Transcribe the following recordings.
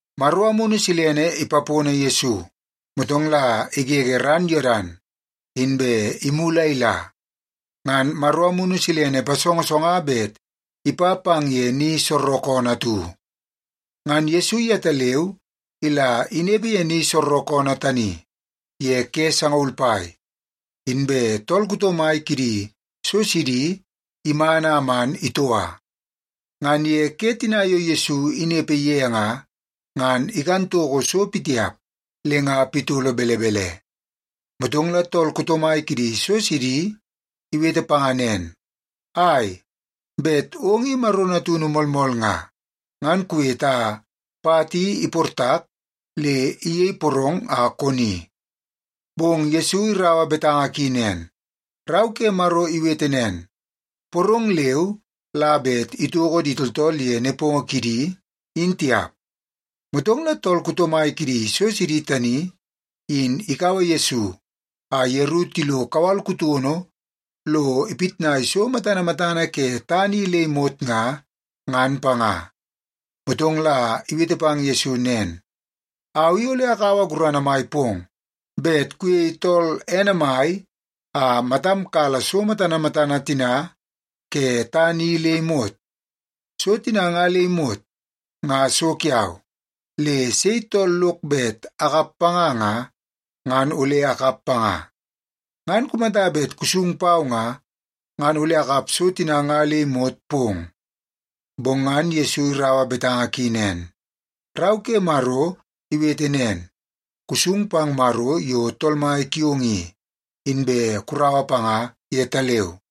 Maro Amunu Silene ipapono Yesu, motong la igege ran Yodan, inbe imulu a ila. Ngan Maro Amunu Silene ipasongosonga bet ipa pang ye ni soorookoonoo atu. Ngan Yesu yetaleu ila inepe ye ni soorookoonoo tani ye ke sangaul pai, inbe tool kuto mai kidi so sidi iman a man itoua. Ngan ye ke tina yo Yesu inepe ye nga, ngan ikan toko so pitiap le nga pitolo belebele. Motong la tool kuto mai kidi so sidi iwete panga nen, “Ai, bet ong i Maro natunu moolmool nga, ngan kuwete a pat i iportak le iyei porong a koni.” Bong Yesu iraua betanga ki nen, “Rau ke Maro iwete nen, ‘Porong leu la bet itoko di tooltool ye nepongo kidi, in tiap.’” Motong la tool kuto mai kidi so sidi tani in ikaua Yesu a yeru tilo kawal kutono lo ipitnai so matana matana ke tana i le imot nga, ngan panga. Motong la iwete pang Yesu nen, “Au i ole akaua gurana mai pong bet kuyei tool ene mai a matam kala so matana matana tina ke tana i le imot. So tina nga le imot, nga so kiau. Le sei tool lok bet akap panga nga, ngan ole akap panga. Ngan kumata bet kusung pau nga, ngan ole akap so tina nga le imot pong.” Bong ngan Yesu iraua betanga ki nen, “Rau ke Maro iwete nen, ‘Kusung pang Maro yo Tool Mai kiong i, inbe kuraua panga yetaleu.’”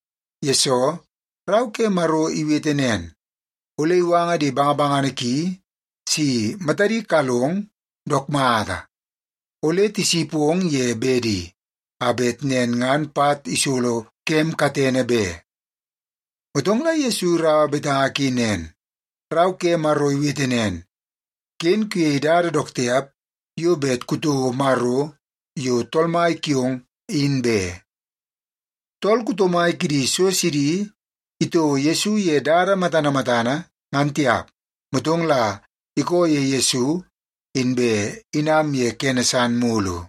yesoo Rau ke Maro iwete nen, ‘Ole iwanga di bangabangana ki si matadi kalong dook mata. Ole tisipong ye bedi, a bet nen ngan pat isolo kem katene be.’” Motong la Yesu iraua betanga ki nen, “Rau ke Maro iwete nen, ‘Ken kuyei dada dook tiap yo bet kutouo Maro yo Tool Mai kiong, in be.’” Tool kuto mai kidi so sidi itouo Yesu ye dada matana matana, ngan tiap. Motong la ikoo ye Yesu, inbe inam ye kene san mulu.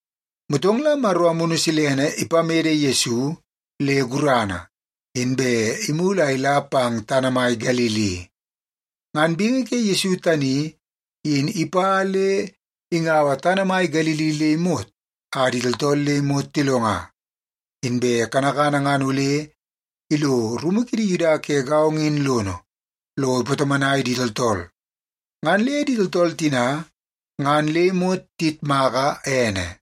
Motong Maro Amunu Silene ipamede Yesu le gurana, inbe imulu a ila pang tana mai Galili. Ngan bingi ke Yesu tani in ipa le ingaua tana mai Galili le imot a di tooltool le imot tilonga. Inbe kanakana ngan ole ilo rumu kidi Yuda ke gaongo in lono, lo ipatomonai di tooltool. Ngan le di tooltool tina ngan le imot tiyitmaka ene.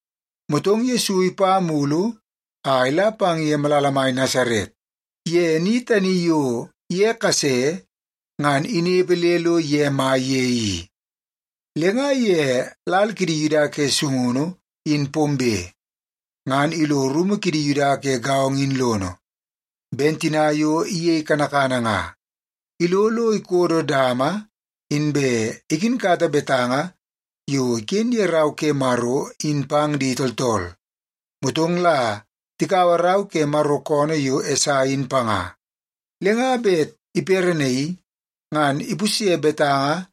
Motong Yesu ipa mulu a ila pang ye malala mai Nasaret, ye ni tani yo ye kase ngan inepe le lo ye mai ye i. Le nga ye lal kidi Yuda ke sungunu in pombe, ngan ilo rumu kidi Yuda ke gaongo in lono, ben tina yo iyei kanakana nga. Ilo lo ikodo dama, inbe ikinkata betanga yo iken ye Rau ke Maro in pang di tooltool. Motong la tikaua rau ke Maro koonoo yo Esai in panga. Le nga bet iperenaii ngan ipusye betanga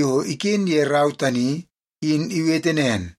yo iken ye rau tani in iwete nen,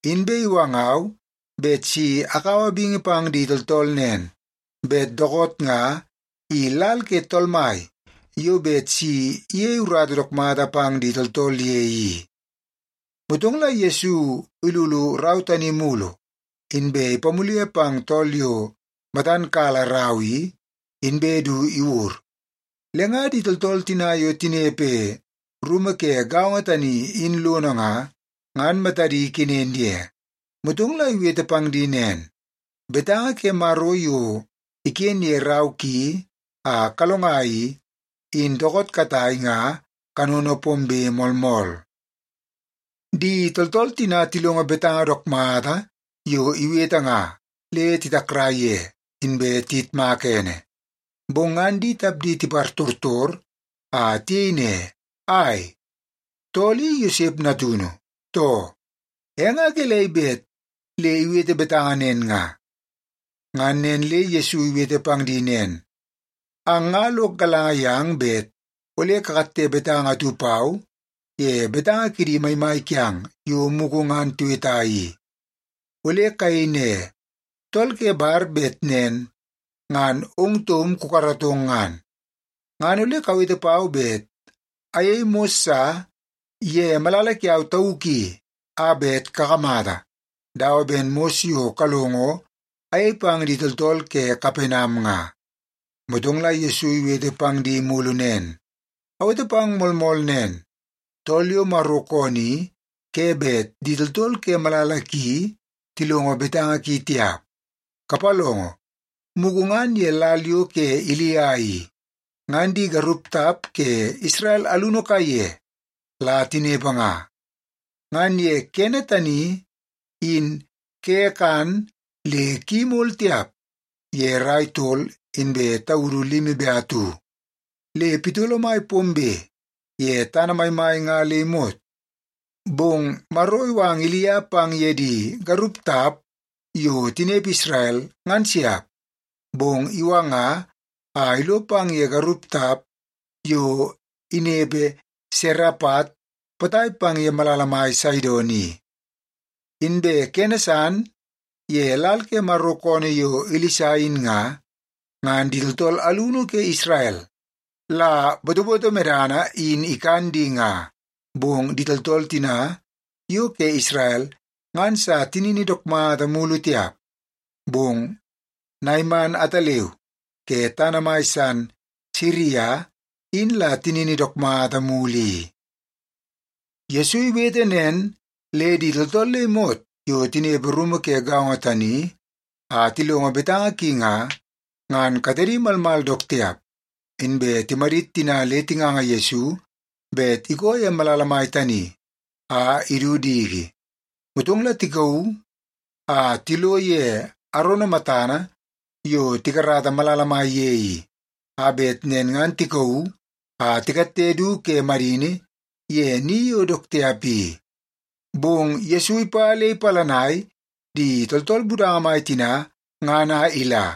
Inbe iwangau bet si akaua bingi pang di tooltool nen, bet dookoot nga i lal ke Tool Mai yo bet si iyei urata dook mata pang di tooltool ye i.” Motong la Yesu ilulu rau tani mulu, inbe ipamule pang tool yo matan kala rau i, inbe du iwur. Le nga di tooltool tina yo tinepe rumu ke gaongo tani in lono nga, ngan matadi kenen ye. Motong la iwete pang di nen, “Betanga ke Maro yo iken ye rau ki a kalonga i, in dookoot katai nga kanono pombe moolmool.” Di tooltool tina tilongo betanga dook mata yo iwete nga, le titakrai ye, inbe tiyitmaka ene. Bong ngan di tapdi tipartortor a tiyei ne, “Ai, tool i Yosep natunu, too? E nga gelei bet le iwete betanga nen nga?” Ngan nen le Yesu iwete pang di nen, “Ang nga lok galanga yang bet ole kakatte betanga atu pau ye betanga kidi maimai kiang yo mugu ngan tiweta i. Ole kayei ne, ‘Tool ke bar bet nen ngan ong taum kukaratong ngan.’ Ngan ole kawete pau bet ayei mos sa ye malala kiau tauk i a bet kakamata, dawa ben mos yo kalongo ayei pang di tooltool ke Kapenam nga.” Motong la Yesu iwete pang di mulu nen, “Awete pang moolmool nen, tool yo Maro koonoo i ke bet di tooltool ke malala ki tilongo betanga ki tiap. Kapalongo, mugu ngan ye lal yo ke Ilia i, ngan di garup tap ke Isrel alunu kaiye la tinepe nga. Ngan ye kene tani, in ke kan le ki imol tiap ye rai tol inbe taudu limi be atu, le pitolo mai pombe ye tana maimai nga le imot. Bong Maro iwanga Ilia pang ye di garup tap yo tinepe Isrel, ngan siap. Bong iwanga a ilo pang ye garup tap yo inepe Serepat potai pang ye malala mai Saidon i. Inbe kene san, ye lal ke Maro koonoo yo Ilisa in nga, ngan di tooltool alunu ke Isrel la botoboto medana in ikan di nga. Bong di tooltool tina yo ke Isrel ngan sa tinini dook mata mulu tiap. Bong Naiman ataleu ke tana mai san Siria in la tinini dook mata mulu i.” Yesu iwete nen le di tooltool le imot yo tinepe rumu ke gaongo tani a tilongo betanga ki nga, ngan katedi malmal dook tiap. Inbe timadit tina le tinganga Yesu bet ikoo ye malala mai tani a idu diki. Motong la tikauu a tilo ye arono matana yo tikarata malala mai ye i, a bet nen ngan tikauu a tikatte du ke madini ye ni yo dook tiap i. Bong Yesu ipa le ipalanai di tooltool budanga mai tina ngan a ila.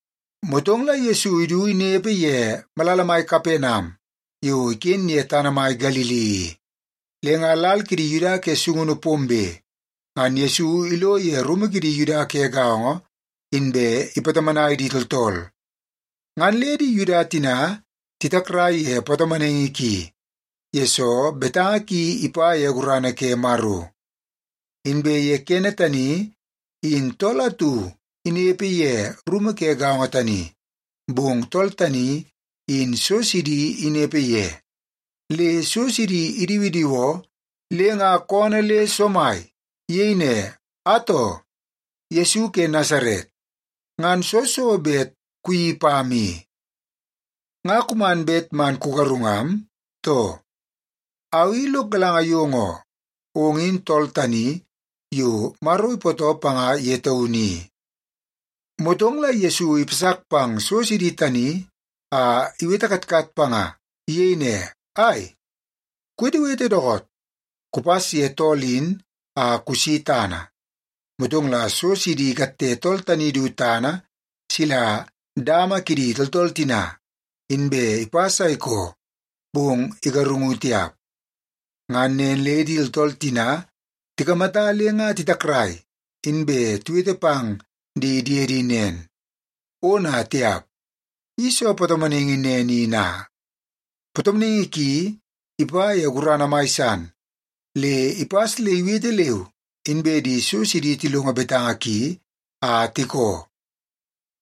Motong la Yesu idu inepe ye malala mai Kapenam yo iken ye tana mai Galili i. Le nga lal kidi Yuda ke sungunu pombe, ngan Yesu ilo ye rumu kidi Yuda ke gaongo, inbe ipatomonai di tooltool. Ngan le di Yuda tina titakrai ye patomonaingi ki, yesoo betanga ki ipa ye gurana ke Maro. Inbe ye kene tani, in tool atu inepe ye rumu ke gaongo tani, bong tool tani in so sidi inepe ye. Le so sidi idiwidiwoo le nga koonoo le somai. Iyei ne, “Atoo! Yesu ke Nasaret, ngan soo so bet kuyeii pam i? Nga kuman bet man kugarungam, too? Au i lok galanga yong oo, ong in Tool Tani Yo Maro Ipootoo Panga Ye Taunu I.” Motong la Yesu ipasak pang so sidi tani a iwete katkat panga. Iyei ne, “Ai, kuwetewete dookoot! Kupas ye tool in a kusi tana!” Motong la so sidi ikatte tool tani du tana sila dama kidi tooltool tina, inbe ipas a ikoo, bong igarungu tiap. Ngan nen le di tooltool tina tikamata le nga titakrai, inbe tiwete pang di diedi nen, “Ona tiap! I soo patomonaingi nen i na? Patomonaingi ki ipa ye gurana mai san, le ipas le iwete leu, inbe di so sidi tilongo betanga ki a tikoo!”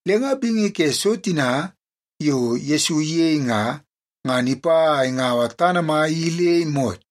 Le nga bingi ke so tina yo Yesu iyei nga, ngan ipa a ingaua tana mai i le imot.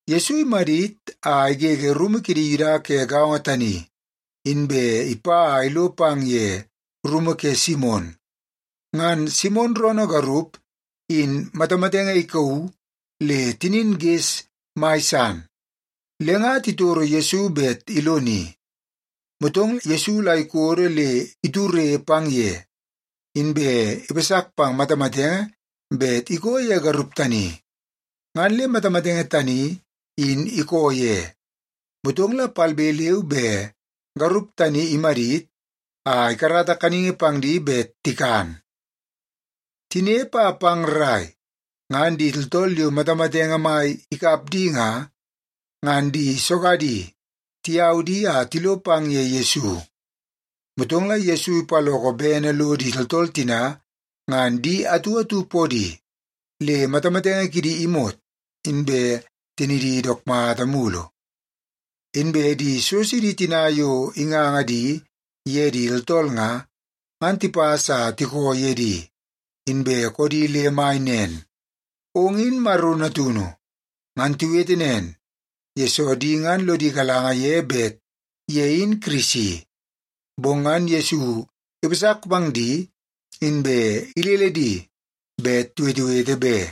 Yesu imadit a igege rumu kidi Yuda ke gaongo tani, inbe ipa a ilo pang ye rumu ke Simon. Ngan Simon roonoo garup in matamatenge ikauu le tinin ges mai san. Le nga titoro Yesu bet iloni. Motong Yesu la ikodo le iture pang ye, inbe ipasak pang matamatenge bet ikoo ye garup tani, ngan le matamatenge tani in ikoo ye. Motong la palbe leu be garup tani imadit a ikarata kaningi pang di bet tikan. Tinepe a pang rrai, ngan di tooltool yo matamatenge mai ikap di nga, ngan di sogadi tiyau di a tilo pang ye Yesu. Motong la Yesu ipaloko bene lo di tooltool tina ngan di atu atu podi, le matamatenge kidi imot inbe tinidi dook mata mulu. Inbe di so sidi tina yo inganga di ye di tooltool nga, ngan tipas a tikoo ye di, inbe koodi le mai nen, “Ong in Maro natunu!” Ngan tiwete nen, yesoo di ngan lodi galanga ye bet ye in Kirisi. Bong ngan Yesu ipasak pang di, inbe ilele di bet tiwetewete be.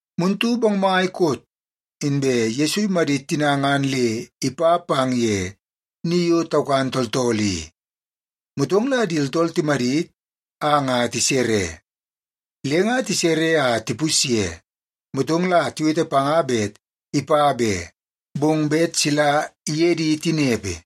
Muntu bongmai koot, inbe Yesu imadit tina ngan le ipa pang ye ni yo taukan tooltool i. Motong la di tooltool timadit a nga tisere. Le nga tisere a tipusye, motong la tiwete panga bet ipa be, bong bet sila iye di tinepe.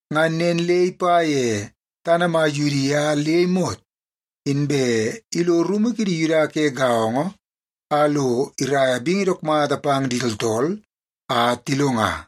Ngan nen le ipa ye tana mai Yudia le imot, inbe ilo rumu kidi Yuda ke gaongo a lo iraia bingi dook mata pang di tooltool a tilonga.